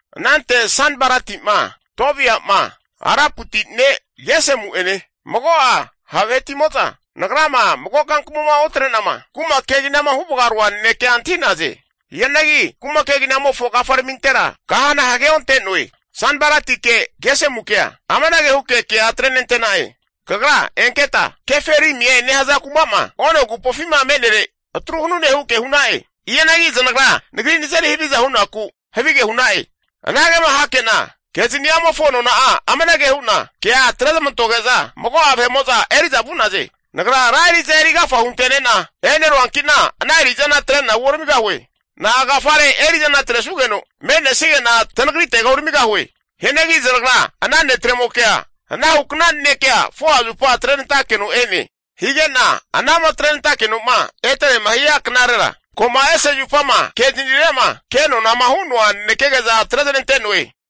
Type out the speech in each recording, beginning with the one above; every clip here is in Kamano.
Anante Sanbalati'ma, Tobia'ma, Araputi ne' Gesemu'ene mago'a ha' vahetimo'za, nagrama mago kankamuma otre'nama kuma keginama huvagaroa nanekea antahi'naze. Hianagi kuma keginamofo kafaramintera kahana hageonte'noe. Sanbalatike Gesemukea amanage huke kea atrenantena'e, Kagra enketa Keferimie nehaza kumama Ono agupofima me'nere atru hanune huke hu'na'e. Hianagi zanagra nagri nazeri haviza hunaku havige hu'na'e. Anagema hake'na ana kezani'amofo nona'a amanage hu'na kea atrezamantoge'za, mago'a vahe'mo'za eri'za vu'naze. Nagra ra eri'za eri agafa hunte'nena e'neruanki'na ana eri'zana atre'na uoramigahue. Na'agafare eri'zana atresanugeno me'nesige'na tanagritega uramigahue? Hianagi zanagra ana netremokea anahukna nanekea 4'a zupa atrenantakeno e'ne. Hige'na anama atrenantakeno'ma eterema hia knarera, ko'ma ese zupama kezanire'ma ke nonama hu'noa nanekege'za atrezanante'noe.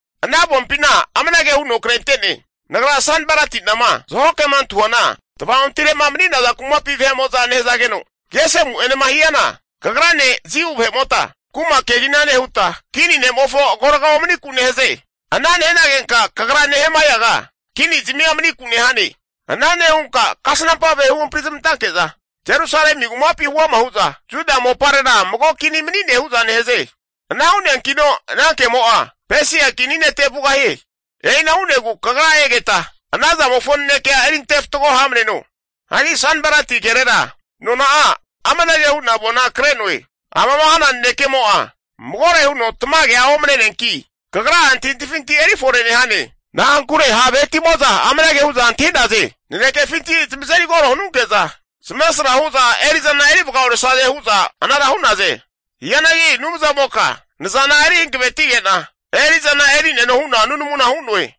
Ana avompina amanage huno krente'ne, Nagra Sanbalati'nama zaho kema antahuana tvaontire'ma mani'naza kumapi vahe'mo'za nehazageno, Gesemu'enema hiana, kagrane Jiu vahe'mota kuma kegina nehuta, kini ne'mofo agorga omaniku nehaze. Ana nehanagenka kagra Nehemaiaga kini zamia maniku nehane. Ana nehunka kasnampa vahe huhampri zamantanke'za Jerusalemi kumapi huama hu'za, Juda moparera mago kini mani'ne hu'za nehaze. Ana hu'neankino ana kemo'a Pesia kini nete vugahie. E'ina hu'negu kagra egeta, ana zamofo nanekea erinte fatgo ha'maneno. Hagi Sanbalati kerera nona'a amanage hu'na avona kre'noe. Amama hana nanekemo'a magore huno tamagea omne'neanki, kagra'a antahintahifinti eri fore nehane. Na'ankure ha' vahetimo'za amanage hu'za antahi'naze, nanekefinti zamazeri koro hanunke'za, zamesra hu'za eri'zana eri vagaoresaze hu'za anara hu'naze. Hianagi Anumzamoka nazana eri hankavetige'na eri'zana eri'neno hu'na nunamuna hu'noe.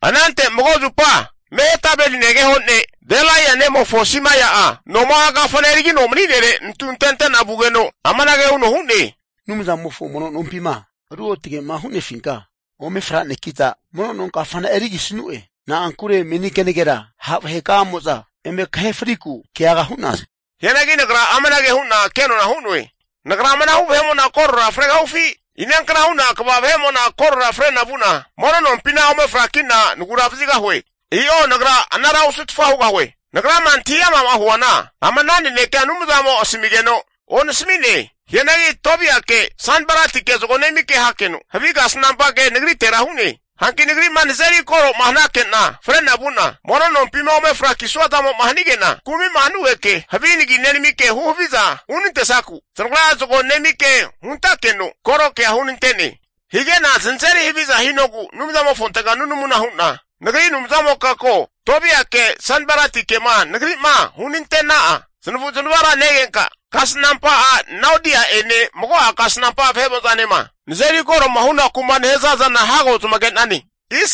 Anante mago zupa Mehetabeli negeho ne' Delaia nemofo Simai'a noma'a kafana erigino mani'nere nantu antente'na vugeno, amanage huno hu'ne, Anumzamofo mono nompima ruotage'ma hu'nefinka ome franekita, mono no kafana erigisanu'e. Na'ankure meni kenagera ha' vahekamo'za eme kahe friku keaga hu'naze. Hianagi nagra amanage hu'na kenona hu'noe, Nagra amanahu vahe'mo'na korora fregahufi? Inankna hu'na kva vahe'mo'na korora frena vu'na mono nompina ome frakina nagura vazigahue? I'o, nagra anara ovutfa hugahue. Nagrama antahi ama'ma huana ama ana nanekea Anumzamo asamigeno onasami'ne. Hianagi Tobiake Sanbalatike zago nemike hakeno, havi kasnampa ke nagritera hu'ne. Hanki nagri'ma nazeri koro'ma hanake'na koroma fre'na vu'na mono nompima ome frakisua zamo'ma hanige'na kumi'ma hanugeke, havi nagi nenamike huhaviza hunantesnanku, zanagra zago nemike huntakeno koro kea hunante'ne. Hige'na zanazeri haviza hinogu Anumzamofontega nunamuma hu'na nagri Anumzamoka ko, Tobiake Sanbalatikema nagri'ma hunante'na'a zanavu zanavara negenka, kasnampa a' Naodia'ene mago'a kasnampa vahe'mo'zanema nazeri kore'ma hunaku'ma nehaza zana hago zamage'nane.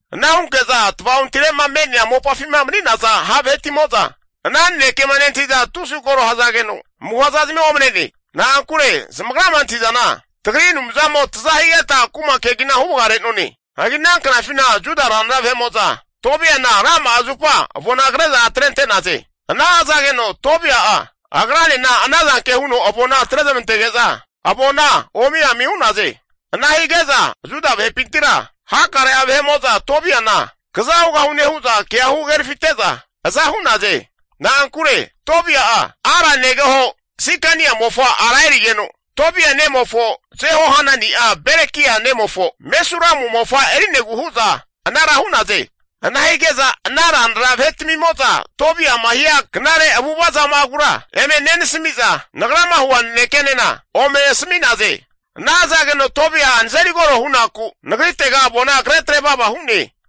Ana hunke'za tva'ontire'ma me'nea mopafima mani'naza ha' vahetimozama ana nanekema nentahi'za tusi koro hazageno, amuha zazamia omane'ne. Na'ankure zamagrama antahi'zana tagri Anumzamo taza higeta kuma kegina huvaga re'none. Hagi ana knafina Juda ranra vahe'mo'za Tobiana rama'a zupa avona kre'za atrente'naze. Ana hazageno Tobia'a agranena anazanke huno avona atrezamantege'za avona omi ami hu'naze. Ana hige'za Juda vahepintira hakare'a vahe'mo'za Tobiana kza hugahune hu'za kea hu hagerafite'za aza hu'naze. Na'ankure Tobia'a Ara negeho Sikania mofa ara erigeno, Tobia nemofo Jehohanani'a Berekia nemofo Mesulamu mofa eri'negu hu'za anara hu'naze. Ana hige'za ana ranra vahetamimo'za Tobia'ma hia knare avu'ava zama'agura eme nenasami'za, nagrama hua nanekenena ome asami'naze. Ana hazageno Tobia'a nazeri koro hunaku nagritega avona kre atrevava hu'ne.